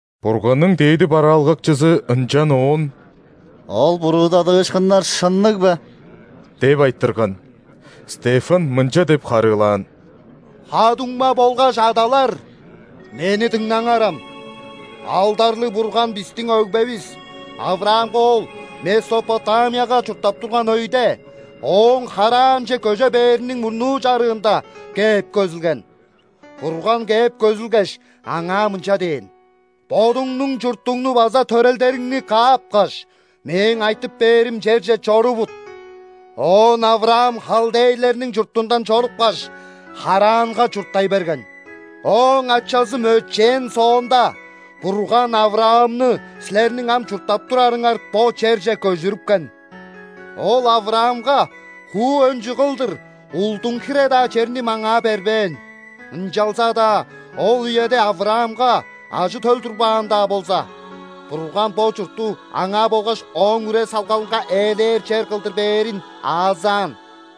Бурганның дээди бараалгакчызы ынчан оон: «Ол буруудадыышкыннар шынныг бе?» – деп айтырган. Стефан мынча деп харыылаан: «Ха-дуңма болгаш адалар! Мени дыңнаңарам. Алдарлыг Бурган бистиң өгбевис ·Авраамга ол Месопотамияга чурттап турган өйде, ооң Харранче көже бээриниң мурнуу чарыында, кээп көзүлген. Бурган кээп көзүлгеш, аңаа мынча дээн: „Бодуңнуң чуртуңну база төрелдериңни каапкаш, Мээң айтып бээрим черже чорувут“. Оон Авраам халдейлерниң чуртундан чорупкаш, Харранга чурттай берген. Ооң ачазы мөчээн соонда, Бурган Авраамны силерниң ам чурттап турарыңар бо черже көжүрүпкен. Ол Авраамга хуу өнчү кылдыр улдуң хире-даа черни маңаа бербээн. Ынчалза-даа ол үеде Авраамга ажы-төл турбаан-даа болза, Бурган бо чуртту аңаа болгаш ооң үре-салгалынга ээлээр чер кылдыр бээрин аазаан.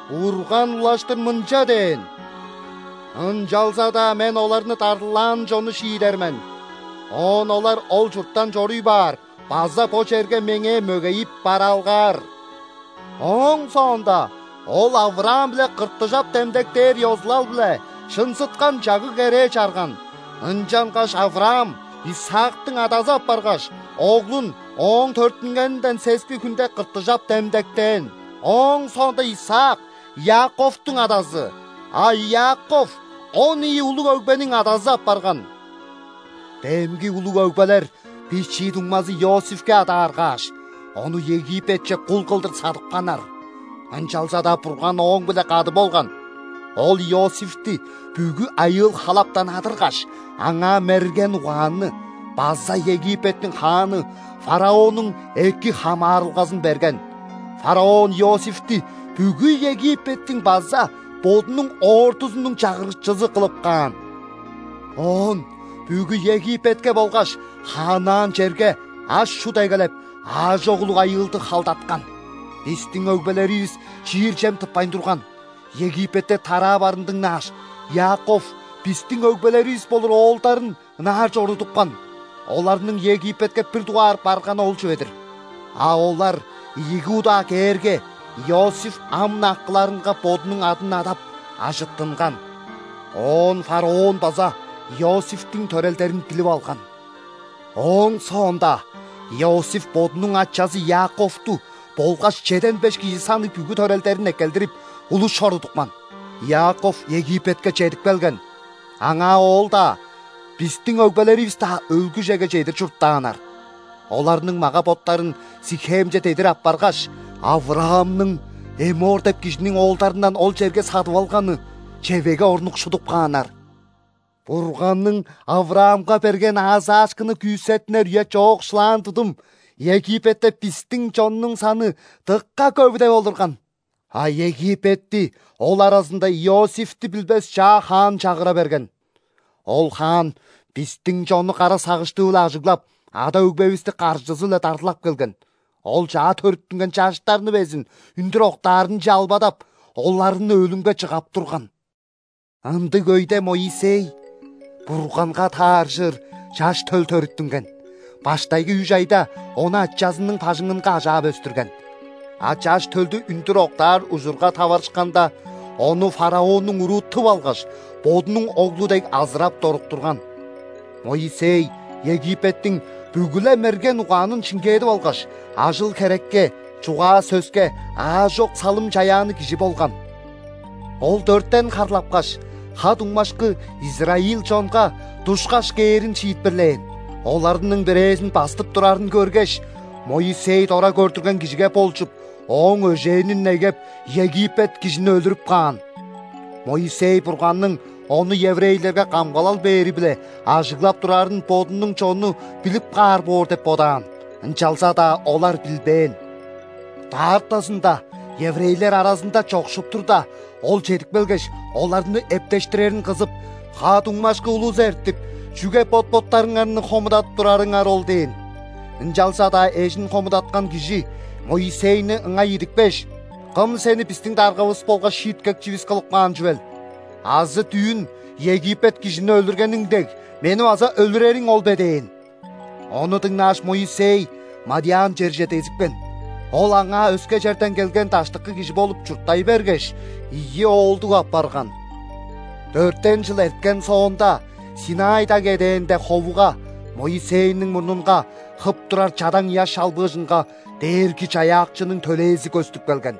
Бурган улаштыр мынча дээн: „Ынчалза-даа Мен оларны дарлаан чонну шиидер мен. Оон олар ол чурттан чоруй баар база бо черге Меңээ мөгейип бараалгаар“. Ооң соонда Ол Авраам-биле ·кыртыжап демдектээр ёзулал-биле шынзыткан чагыг-керээ чарган. Ынчангаш Авраам Исаактың адазы апаргаш, оглун ооң төрүттүнгенинден сески хүнде кыртыжап демдектээн. Ооң соонда Исаак – Иаковтуң адазы, а Иаков – он ийи улуг өгбениң адазы апарган. Демги улуг өгбелер бичии дуңмазы Иосифке адааргааш, ону Египетче кул кылдыр садыпканнар. Ынчалза-даа Бурган ооң-биле кады болган. Ол Иосифти бүгү айыыл-халаптан адыргаш, аңаа мерген угаанны база Египеттиң хааны фараоннуң эки хамаарылгазын берген. Фараон Иосифти бүгү Египеттиң база бодунуң ордузунуң чагырыкчызы кылып каан. Оон бүгү Египетке болгаш ханаан черге аш-чут эгелеп, аажок улуг айыылды халдаткан. Бистиң өгбелеривис чиир чем тыппайн турган. Египетте тараа барын дыңнааш, Иаков бистиң өгбелеривис болур оолдарын ынаар чорудупкан. Оларның Египетке бир дугаар барганы ол чүве-дир. А олар ийиги удаа кээрге, Иосиф ам-на акыларынга бодунуң адын адап, ажыттынган, оон фараон база Иосифтиң төрелдерин билип алган. Ооң соонда Иосиф бодунуң ачазы Иаковту болгаш чеден беш кижи санныг бүгү төрелдерин эккелдирип, улус чорудупкан. Иаков Египетке чедип келген. Аңаа ол-даа, бистиң өгбелеривис-даа өлгүжеге чедир чурттааннар. Оларның мага-боттарын Сихемче дедир аппаргаш, Авраамның Эммор деп кижиниң оолдарындан ол черге садып алганы чевегге орнукшудуп кааннар. Бурганның Авраамга берген аазаашкыны күүсеттинер үе чоокшулаан тудум, Египетте бистиң чоннуң саны дыка көвүдеп олурган. А Египетти ол аразында Иосифти билбес чаа хаан чагыра берген. Ол хаан бистиң чонну кара сагыштыы-биле ажыглап, ада-өгбевисти каржызы-биле дарлап келген. Ол чаа төрүттүнген чаштарны безин үндүр октаарынче албадап, оларны өлүмге чыгап турган. Ындыг өйде Моисей – Бурганга тааржыр чаш төл – төрүттүнген. Баштайгы үш айда ону ачазының бажыңынга ажаап өстүрген. А чаш төлдү үндүр октаар ужурга таварышканда, ону фараоннуң уруу тып алгаш, бодунуң оглу дег азырап доруктурган. Моисей Египеттиң бүгү-ле мерген угаанын шиңгээдип алгаш, ажыл-херекке, чугаа-сөске аажок салым-чаяанныг кижи болган. Ол дөртен харлапкаш, ха-дуңмашкы израиль чонга душкаш кээрин шиитпирлээн. Оларның бирээзин бастып турарын көргеш, Моисей дора көрдүрген кижиге болчуп, ооң өжээнин негеп, египет кижини өлүрүп каан. Моисей Бурганның ону еврейлерге камгалал бээри-биле ажыглап турарын бодунуң чону билип каар боор деп бодаан, ынчалза-даа олар билбээн. Даартазында, еврейлер аразында чокшуп турда, ол чедип келгеш, оларны эптештирерин кызып: „Ха-дуңмашкы улус эртип, чүге бот-боттарыңарны хомудадып турарыңар ол?“ – дээн. Ынчалза-даа эжин хомудаткан кижи Моисейни ыңай идипкеш: „Кым сени бистиң даргавыс болгаш шииткекчивис кылып каан чүвел? Азы дүүн египет кижини өлүргениң дег, мени база өлүрериң ол бе?“ – дээн. Ону дыңнааш, Моисей мадиан черже дезипкен. Ол аңаа өске черден келген даштыкы кижи болуп чурттай бергеш, ийи оолдуг апарган. Дөртен чыл эрткен соонда, ·Синай даг эдээнде ховуга, Моисейниң мурнунга, хып турар чадаң ыяш чалбыыжынга Дээрги-Чаяакчының төлээзи көстүп келген.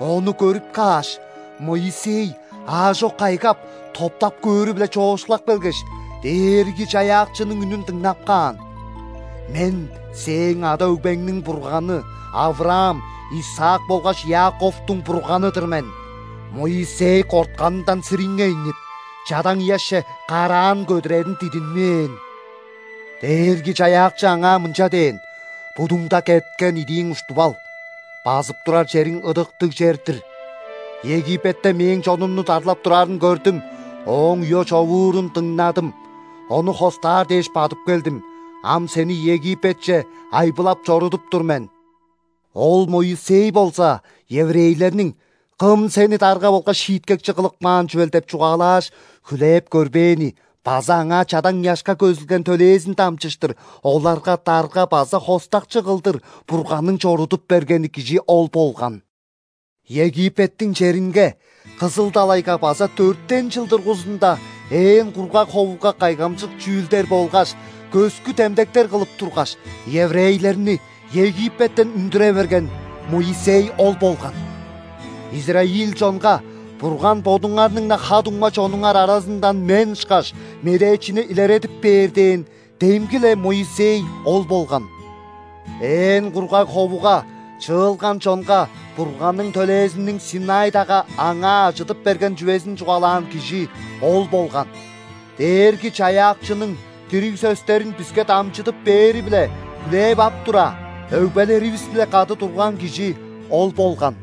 Ону көрүп кааш, Моисей аажок кайгап, топтап көөрү-биле чоокшулап келгеш, Дээрги-Чаяакчының үнүн дыңнап каан: „Мен – сээң ада-өгбеңниң Бурганы, Авраам, Исаак болгаш Иаковтуң Бурганы-дыр мен“. Моисей кортканындан сириңейнип, чадаң ыяшче караан көдүрерин дидинмээн. Дээрги-Чаяакчы аңаа мынча дээн: „Будуңда кеткен идииң уштуп ал. Базып турар чериң ыдыктыг чер-дир. Египетте Мээң чонумну дарлап турарын көрдүм, ооң уё-човуурун дыңнадым. Ону хостаар дээш, бадып келдим. Ам сени Египетче айбылап чорудуп тур мен“. Ол Моисей болза еврейлерниң: „Кым сени дарга болгаш шииткекчи кылып каан чүвел?“ – деп чугаалааш, хүлээп көрбээни база аңаа чадаң ыяшка көзүлген төлээзин дамчыштыр оларга дарга база хостакчы кылдыр Бурганның чорудуп бергени кижи ол болган. Египеттиң черинге, Кызыл далайга база дөртен чыл дургузунда ээн кургаг ховуга кайгамчык чүүлдер болгаш көскү демдектер кылып тургаш, еврейлерни Египеттен үндүре берген Моисей ол болган. Израиль чонга: „Бурган бодуңарның-на ха-дуңма чонуңар аразындан мен ышкаш медээчини илередип бээр“ – дээн демги-ле Моисей ол болган. Ээн кургаг ховуга чыылган чонга Бурганның төлээзиниң ·Синай дагга аңаа ажыдып берген чүвезин чугаалаан кижи ол болган. Дээрги-Чаяакчының дириг сөстерин биске дамчыдып бээри-биле хүлээп ап тура, өгбелеривис-биле кады турган кижи ол болган.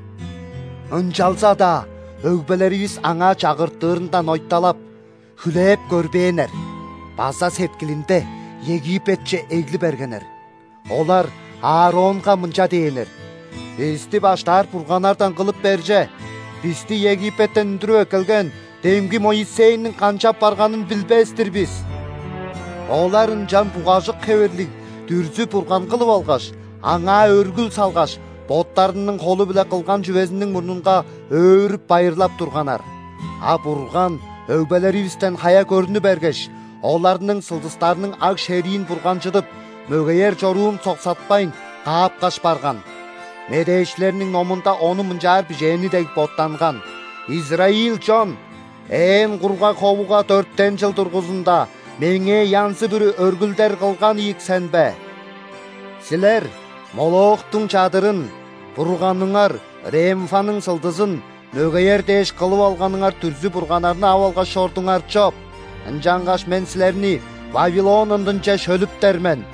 Ынчалза-даа өгбелеривис аңаа чагыртырындан ойталап, хүлээп көрбээннер база сеткилинде Египетче эгли бергеннер. Олар Ааронга мынча дээннер: „Бисти баштаар бурганнардан кылып бер че, бисти Египеттен үндүрүп эккелген демги Моисейниң канчап барганын билбес-тир бис“. Олар ынчан бугажык хевирлиг дүрзү-бурган кылып алгаш, аңаа өргүл салгаш, боттарының холу-биле кылган чүвезиниң мурнунга өөрүп-байырлап турганнар. А Бурган өгбелеривистен хая көрнү бергеш, оларның сылдыстарның аг-шериин бурганчыдып, мөгеер чоруун соксатпайн, каапкаш барган. Медээчилерниң номунда ону мынчаар бижээни дег боттанган:„Израиль чон! Ээн кургаг ховуга дөртен чыл дургузундаМеңээ янзы-бүрү өргүлдер кылган ийик сен бе? Силер Молохтуң чадырын,бурганыңар Ремфанның сылдызын – мөгеер дээш, кылып алганыңар дүрзү-бурганнарны ап алгаш чордуңар чоп.Ынчангаш Мен силерни Вавилон ындынче шөлүптер мен“.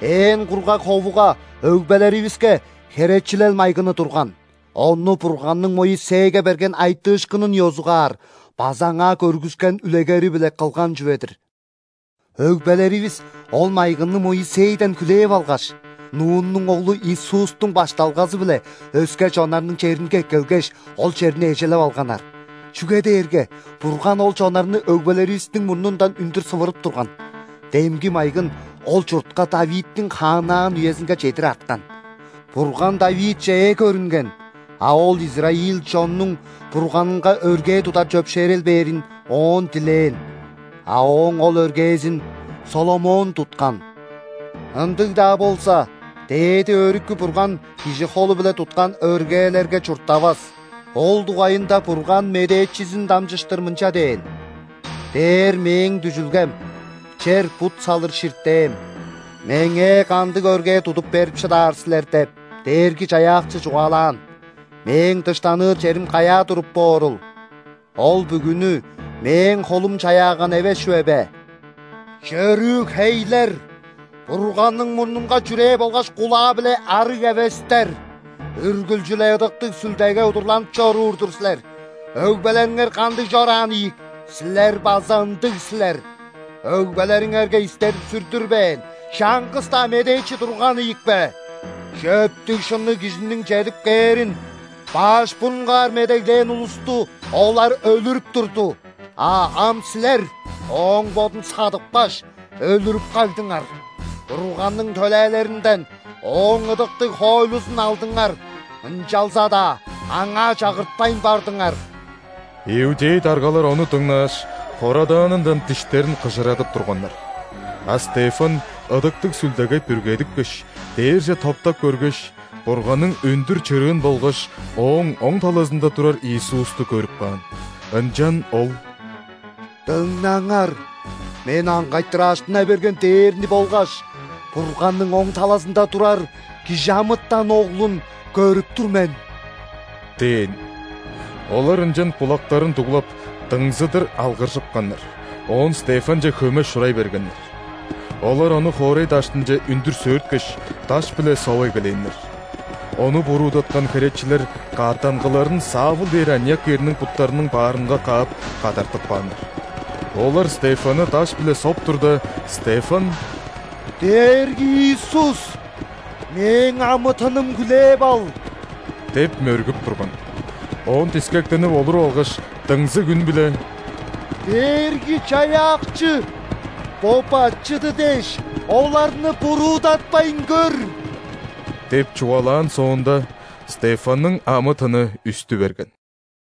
Ээн кургаг ховуга өгбелеривиске Херечилел майгыны турган. Ону Бурганның Моисейге берген айтыышкынын ёзугаар база аңаа көргүскен үлегери-биле кылган чүве-дир. Өгбелеривис ол майгынны Моисейден хүлээп алгаш, Нуннуң оглу Иисустуң башталгазы-биле өске чоннарның черинге эккелгеш, ол черни эжелеп алганнар, чүге дээрге Бурган ол чоннарны өгбелеривистиң мурнундан үндүр сывырып турган. Демги майгын ол чуртка ·Давидтиң хааннаан үезинге чедир арткан. Бурган Давидче ээ көрүнген, а ол израиль чоннуң Бурганынга өргээ тудар чөпшээрел бээрин Оон дилээн. А Ооң ол өргээзин ·Соломон туткан. Ындыг-даа болза, Дээди Өрүкү Бурган кижи холу-биле туткан өргээлерге чурттавас, ол дугайында Бурган медээчизин дамчыштыр мынча дээн: „Дээр – Мээң дүжүлгем, чер – бут салыр ширтээм.Меңээ кандыг өргээ тудуп берип шыдаар силер? – деп, Дээрги-Чаяакчы чугаалаан. –Мээң дыштаныр черим каяа туруп боорул? Ол бүгүнү Мээң холум чаяаган эвес чүве бе?“ Чөрүү хейлер! Бурганның мурнунга чүрээ болгаш кулаа-биле ·арыг эвестер! Үргүлчү-ле Ыдыктыг Сүлдеге удурланып чоруур-дур силер, өгбелериңер кандыг чораан ийик, силер база ындыг силер. Өгбелериңерге истедип-сүрдүрбээн чаңгыс-даа медээчи турган ийикпе? Чөптүг-шынныг Кижиниң чедип кээрин баш бурунгаар медеглээн улусту олар өлүрүп турду, а ам силер Ооң Бодун садыпкаш, өлүрүп кагдыңар. Бурганның төлээлеринден Ооң ыдыктыг хоойлузун алдыңар, ынчалза-даа аңаа чагыртпайн бардыңар!» Иудей даргалар ону дыңнааш, хорадаанындан диштерин кыжырадып турганнар. А Стефан Ыдыктыг Сүлдеге бүргедипкеш, дээрже топтап көргеш, Бурганның өндүр чырыын болгаш Ооң оң талазында турар Иисусту көрүп каан. Ынчан ол: «Дыңнаңар, мен аңгайтыр ажыттына берген дээрни болгаш Бурганның оң талазында турар ·Кижи амытан Оглун көрүп тур мен» – дээн. Олар ынчан кулактарын дуглап, дыңзыдыр алгыржыпканнар, оон Стефанче хөме шурай бергеннер. Олар ону хоорай даштынче үндүр сөөрткеш, даш-биле соп эгелээннер. Ону буруудаткан херечилер каъттангыларын Савл дээр аныяк эрниң буттарының баарынга каап, кадартып кааннар. Олар Стефанны даш-биле соп турда, Стефан: «Дээрги Иисус! Мээң амы-тыным хүлээп ал!» – деп мөргүп турган. Оон дискектенип олуруп алгаш, дыңзыг үн-биле: «Дээрги-Чаяакчы, бо бачыды дээш, оларны буруудатпайн көр!» – деп чугаалаан соонда, Стефанның амы-тыны үстү берген.